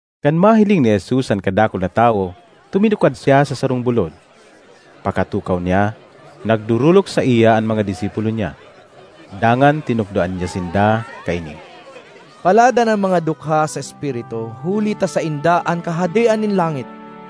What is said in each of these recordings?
Kan mahiling ni Jesus an kadakul na tawo, tuminukad siya sa sarong bulod. Pakatukaw niya, nagdorolok saiya an mga disipulo niya. Dangan tinukdoan niya sinda kaini: ”Paladan an mga dukha sa espiritu, huli ta sainda an Kahadean nin langit!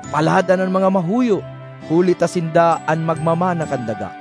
”Paladan an mga mahuyo, huli ta sinda an magmamana kan daga!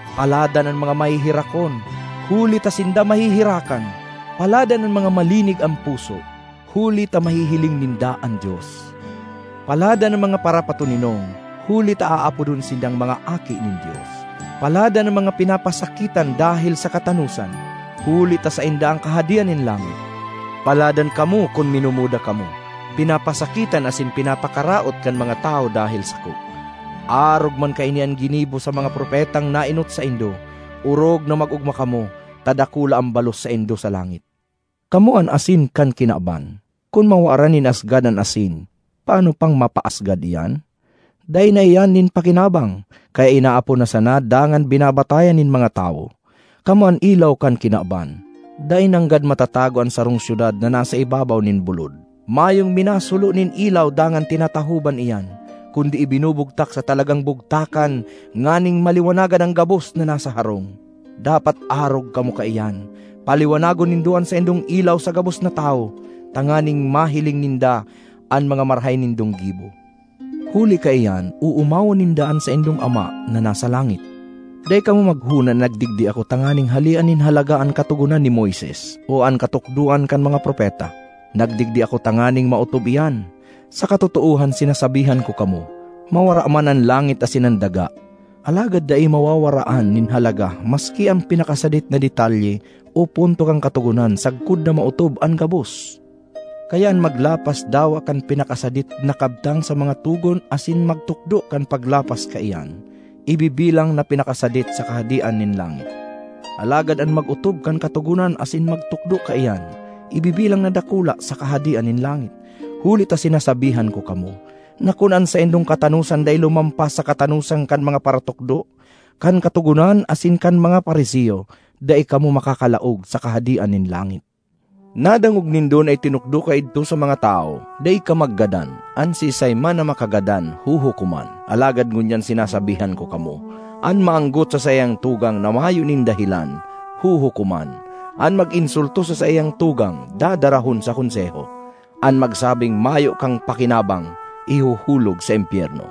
”Paladan an mga maheherakon, huli ta sinda maheherakan! ”Paladan an mga malinig an puso, huli ta mahihiling ninda an Dios! ”Paladan an mga parapatoninong huli ta aapodon sindang mga aki nin Dios! ”Paladan an mga pinapasakitan dahel sa katanosan, huli ta sainda an Kahadean nin langit! ”Paladan kamo kun minumuda kamo, pinapasakitan asin pinapakaraot kan mga tawo dahel sako. Arog man kaini an ginibo sa mga propetang naenot saindo. Orog na mag-ogma kamo, ta dakula an balos saindo sa langit. ”Kamo an asin kan kinaban. Kun mawaran nin asgad an asin, paano pang mapaasgad iyan? Dai na iyan nin pakinabang, kaya inaapon na sana dangan binabatayan nin mga tawo. ”Kamo an ilaw kan kinaban. Dai nanggad matatago an sarong syudad na nasa ibabaw nin bulod. Mayong minasulo nin ilaw dangan tinatahoban iyan; kundi ibinubugtak sa talagang bugtakan nganing maliwanagan an gabos na nasa harong. Dapat arog kamo kaiyan. Paliwanagon nindo an saindong ilaw sa gabos na tawo, tanganing mahiling ninda an mga marahay nindong gibo; huli kaiyan oomawon ninda an saindong Ama na nasa langit. ”Dai kamo maghona na nagdigdi ako tanganing halean nin halaga an Katogonan ni Moises o an katukdoan kan mga propeta; nagdigdi ako tanganing maotob iyan. Sa katotoohan sinasabihan ko kamo, mawara man an langit asin an daga, alagad dai mawawaraan nin halaga maski an pinakasadit na detalye o punto kan Katogonan sagkod na maotob an gabos. Kaya an maglapas dawa kan pinakasadit na kabtang sa mga togon asin magtukdo kan paglapas kaiyan, ibibilang na pinakasadit sa kahadean nin langit. Alagad an mag-otob kan Katogonan asin magtukdo kaiyan, ibibilang na dakula sa Kahadean nin langit. Huli ta sinasabihan ko kamo, na kun an saindong katanosan dai lumampas sa katanosan kan mga paratukdo kan Katogonan asin kan mga Fariseo, dai kamo makakalaog sa Kahadean nin langit. ”Nadangog nindo na itinukdo kaidto sa mga tawo, ‘Dai ka maggadan; an siisay man na makagadan, huhukoman.’ Alagad ngunyan sinasabihan ko kamo: an maanggot sa saiyang tugang (na mayo nin dahelan), huhukoman; an mag-insulto sa saiyang tugang, dadarahon sa Konseho. An magsabing, ‘Mayo kang pakinabang!’ ihuhulog sa impyerno.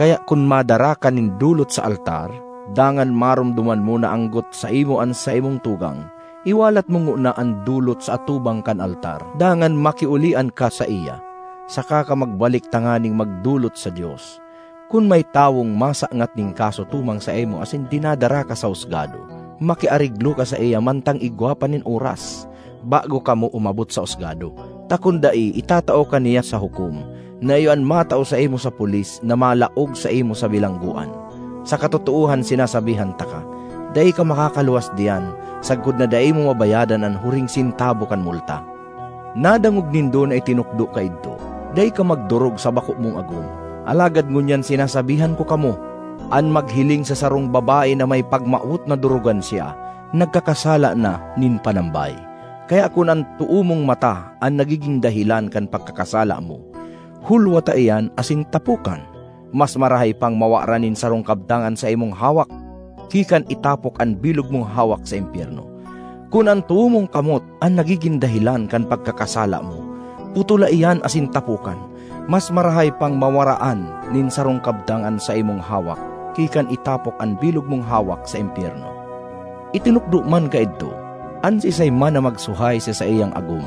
Kaya kun madara ka nin dolot sa altar, dangan maromdoman mo na anggot saimo an saimong tugang, iwalat mo ngona an dolot sa atubang kan altar, dangan makiolian ka saiya. Saka ka magbalik tanganing magdolot sa Dios. ”Kun may tawong masangat nin kaso tumang saimo asin dinadara ka sa husgado, makiareglo ka saiya mantang igwa pa nin oras, bago kamo umabot sa husgado. Ta kun dai, itatao ka niya sa hukom, na iyo an matao saimo sa pulis na malaog saimo sa bilanggoan. Sa katotoohan sinasabihan taka, dai ka makakaluwas diyan, sagkod na dai mo mabayadan an huring sentabo kan multa. ”Nadangog nindo na itinukdo kaidto, ‘Dai ka magdorog sa bako mong agom.’ Alagad ngunyan sinasabihan ko kamo: an maghiling sa sarong babae na may pagmawot na dorogan siya, nagkakasala na nin panambay. Kaya kun an too mong mata an nagigin dahelan kan pagkakasala mo, hulwata iyan asin tapokan! Mas marahay pang mawaran nin sarong kabtang an saimong hawak ki kan itapok an bilog mong hawak sa impyerno. Kun an too mong kamot an nagigin dahelan kan pagkakasala mo, putola iyan asin tapokan. Mas marahay pang mawaraan nin sarong kabtang an saimong hawak ki kan itapok an bilog mong hawak sa impyerno. ”Itinukdo man kaidto, ‘An siisay man na magsuhay sa saiyang agom,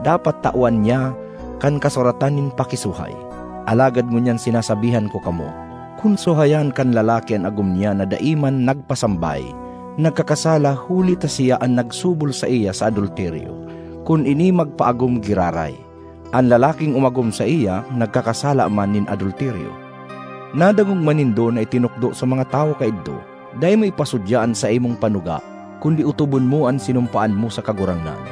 dapat tawan niya kan kasuratan nin pakisuhay.’ Alagad ngunyan sinasabihan ko kamo: kun suhayan kan lalaki an agom niya na dai man nagpasambay, nagkakasala huli ta siya an nagsubol saiya sa adulteryo, kun ini magpaagom giraray. An lalaking umagom saiya nagkakasala man nin adulteryo. ”Nadangog man nindo na itinukdo sa mga tawo kaidto, ‘Dai mo ipasudya an saimong panuga, kundi otobon mo an sinumpaan mo sa Kagurangnan.’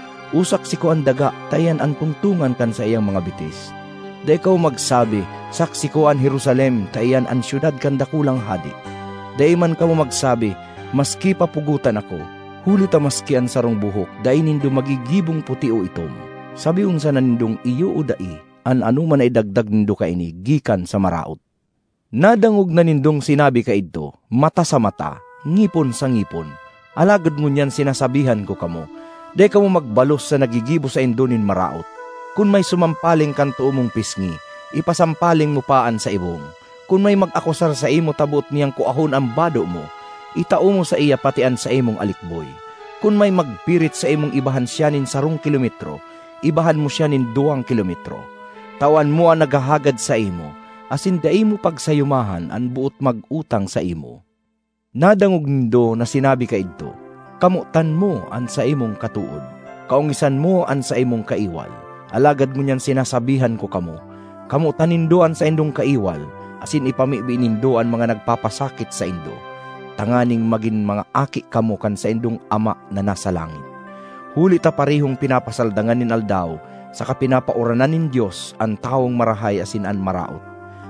o ‘Saksi ko an daga,’ ta iyan an tungtongan kan saiyang mga bitis. Dai kamo magsabi, ‘Saksi ko an Jerusalem,’ ta iyan an syudad kan dakulang Hade. Dai man kamo magsabi, ‘Maski pa pugotan ako,’ huli ta maski an sarong buhok dai nindo magigibong puti o itom. Sabihon sana nindong ‘Iyo’ o ‘Dai’—an anoman na idagdag nindo kaini gikan sa maraot. ”Nadangog na nindong sinabi kaidto, ‘Mata sa mata; ngipon sa ngipon.’ Alagad ngunyan sinasabihan ko kamo: dai kamo magbalos sa naggigibo saindo nin maraot. Kun may sumampaling kan too mong pisngi, ipasampaling mo pa an sa ibong. Kun may mag-akusar saimo ta boot niyang kuahon an bado mo, itao mo saiya pati an saimong alikboy. Kun may magpirit saimong ibahan siya nin sarong kilometro, ibahan mo siya nin duwang kilometro. Tawan mo an naghahagad saimo, asin dai mo pagsayumahan an boot mag-utang saimo. ”Nadangog nindo na sinabi kaidto, ‘Kamotan mo an saimong katood, kaongisan mo an saimong kaiwal.’ Alagad ngunyan sinasabihan ko kamo: kamotan nindo an saindong kaiwal, asin ipamibi nindo an mga nagpapasakit saindo, tanganing magin mga aki kamo kan saindong Ama na nasa langit. Huli ta parehong pinapasaldangan nin aldaw saka pinapauranan nin Dios an tawong marahay asin an maraot,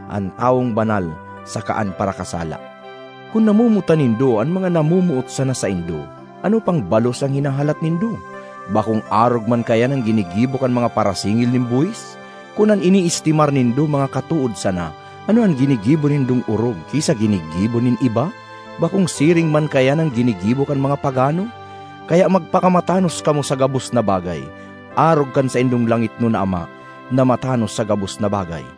an tawong banal saka an parakasala. Kun namomotan nindo an mga namomoot sana saindo, ano pang balos an hinahalat nindo? Bakong arog man kaiyan an ginigibo kan mga parasingil nin buhis? Kun an ineestimar nindo mga katood sana, ano an ginigibo nindong orog ki sa ginigibo nin iba? Bakong siring man kaiyan an ginigibo kan mga pagano? Kaya magpakamatanos kamo sa gabos na bagay, arog kan saindong langitnon na Ama, na matanos sa gabos na bagay.